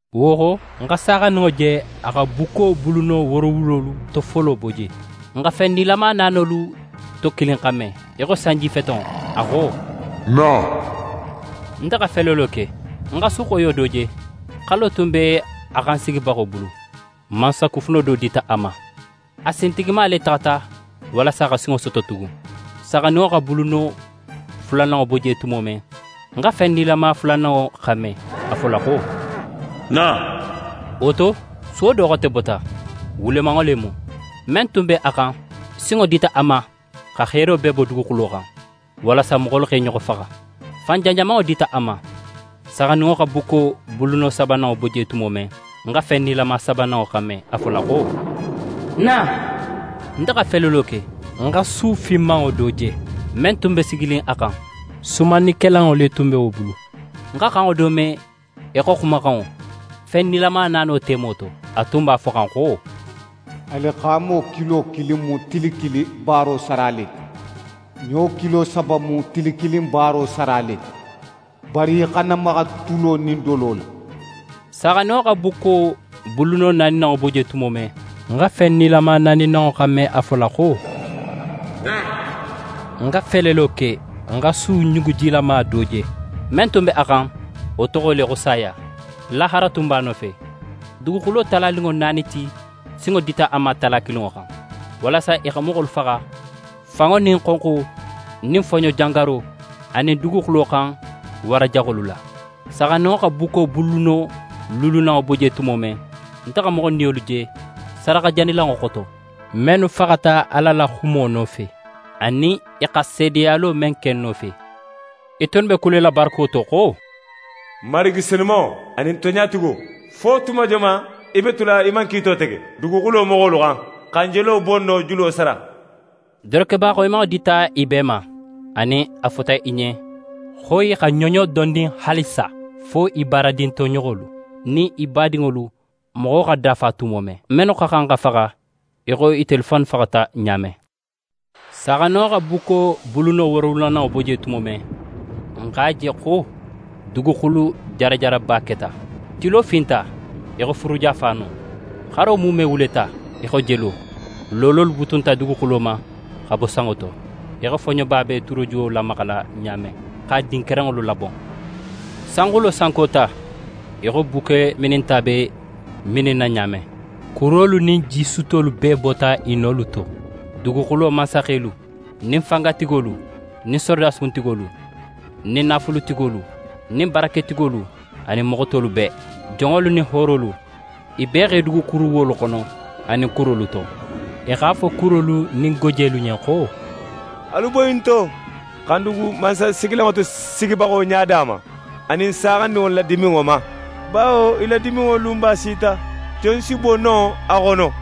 Wo xo, ń xa Saaxandinŋo je, a xa bukko buluno woorowulolu to folo bo je. Ń xa fen nilama naanolu to kilin xanme í xo sanjifetenŋo, a xo: «Na!» Nte xa felelo ke, ń xa su xoyo do je. Xalo tun be a xan sigibaxo bulu. Mansakufuno do dita a ma. A sintigima le taxata walasa xa sinŋo soto tugun. Saaxandinŋo xa buluno fulananŋo bo je tumo men, ń xa fen nilama fulananŋo xanme a fola xo: «Na!» Wo to, suwo do xote bota, wulemanŋo le mu. Men tun b'a xan, sinŋo dita wo ma xa heero bee bo duguxulo xan, walasa moxolu x'e ɲoxo faxa. Fan janjamanŋo dita a ma. Saaxandinŋo xa bukko buluno sabananŋo bo je tumo men, ń xa fen nilama sabananŋo xanme a fola xo: «Na!» Nte xa felelo ke, ń xa su finmanŋo do je. Men tun be siginin a xan, sumannikelanŋo le tun be wo bulu. Ń xa xanŋo do me í xo xumaxanŋo, fen nilama naano temo to, a tun b'a foxan xo: «Alixaamo kilo kilin mu tili kilin baaro sara le ti. Ɲo kilo saba mu tili kilin baaro sara le ti. Bari í xana maxa tulo nin dolo la.» Saaxandinŋo xa bukko buluno naaninanŋo bo je tumo men, ń xa fen nilama naaninanŋo xanme a fola xo: «Na!» Ń xa felelo ke, ń xa su ɲugujilama do je. Men tun be a xan, wo toxo le xo Saya, lahara tun be a nofe. Duguxulo talaninŋo naani ti sinŋo dita i ma tala kilinŋo xan, walasa i xa moxolu faxa fanŋo nin xonxo nin foɲojangaro anin duguxulo xan wara jaxolu la. Saaxandinŋo xa bukko buluno luulunanŋo bo je tumo men, nte xa moxolu niyolu je sadaxajanilanŋo xoto, mennu faxata Ala la xumo nofe, anin i xa seedeyalo men ke nofe. I tunnu be kulela barako to xo: «Marigi senumanŋo, anin tonɲatigo, fo tuma joman í be tula í man kiito tege duguxulo moxolu xan, xa n jelo bonno julo sara?» Dorokeba xoyimanŋo dita i bee ma, anin a fota i ɲen xo i xa i ɲoɲo dondin haalisa, fo i baaradin toɲoxolu nin i badinŋolu moxo xa dafa tumo men, mennu xa xan xa faxa, í xo itelu fannu faxata ɲa men. Saaxandinŋo xa bukko buluno wooronanŋo bo je tumo men, ń x'a je xo duguxulu jarajaraba keta. Tilo finta í xo furuja faano, xaro muume wuleta í xo jelo. Loololu butunta dugo ma xa bo sanŋo to, í xo foɲoba be turojuwo lamaxala ɲa men x'a din kerenŋolu labon. Sanxulo sankota í xo bukke mininta be mininna ɲa men. Kurolu nin jisuttolu bee bota i nolu to. Duguxulo mansaxelu nin fangatigolu nin sorodasi kuntigolu, nin naafulutigolu, nin baraketigolu anin moxo tolu bee, jonŋolu nin hoorolu, i bee x'e dugu kuruwuwolu xono anin kurolu to. I x'a fo kurolu nin gojelu ɲen xo: «Alu boyi n to, xa n dugu mansasigilanŋo tosigibaxo ɲada ma anin Saaxandinŋo la diminŋo ma; bawo i la diminŋo lunba sita. Jon si bo no a xono?»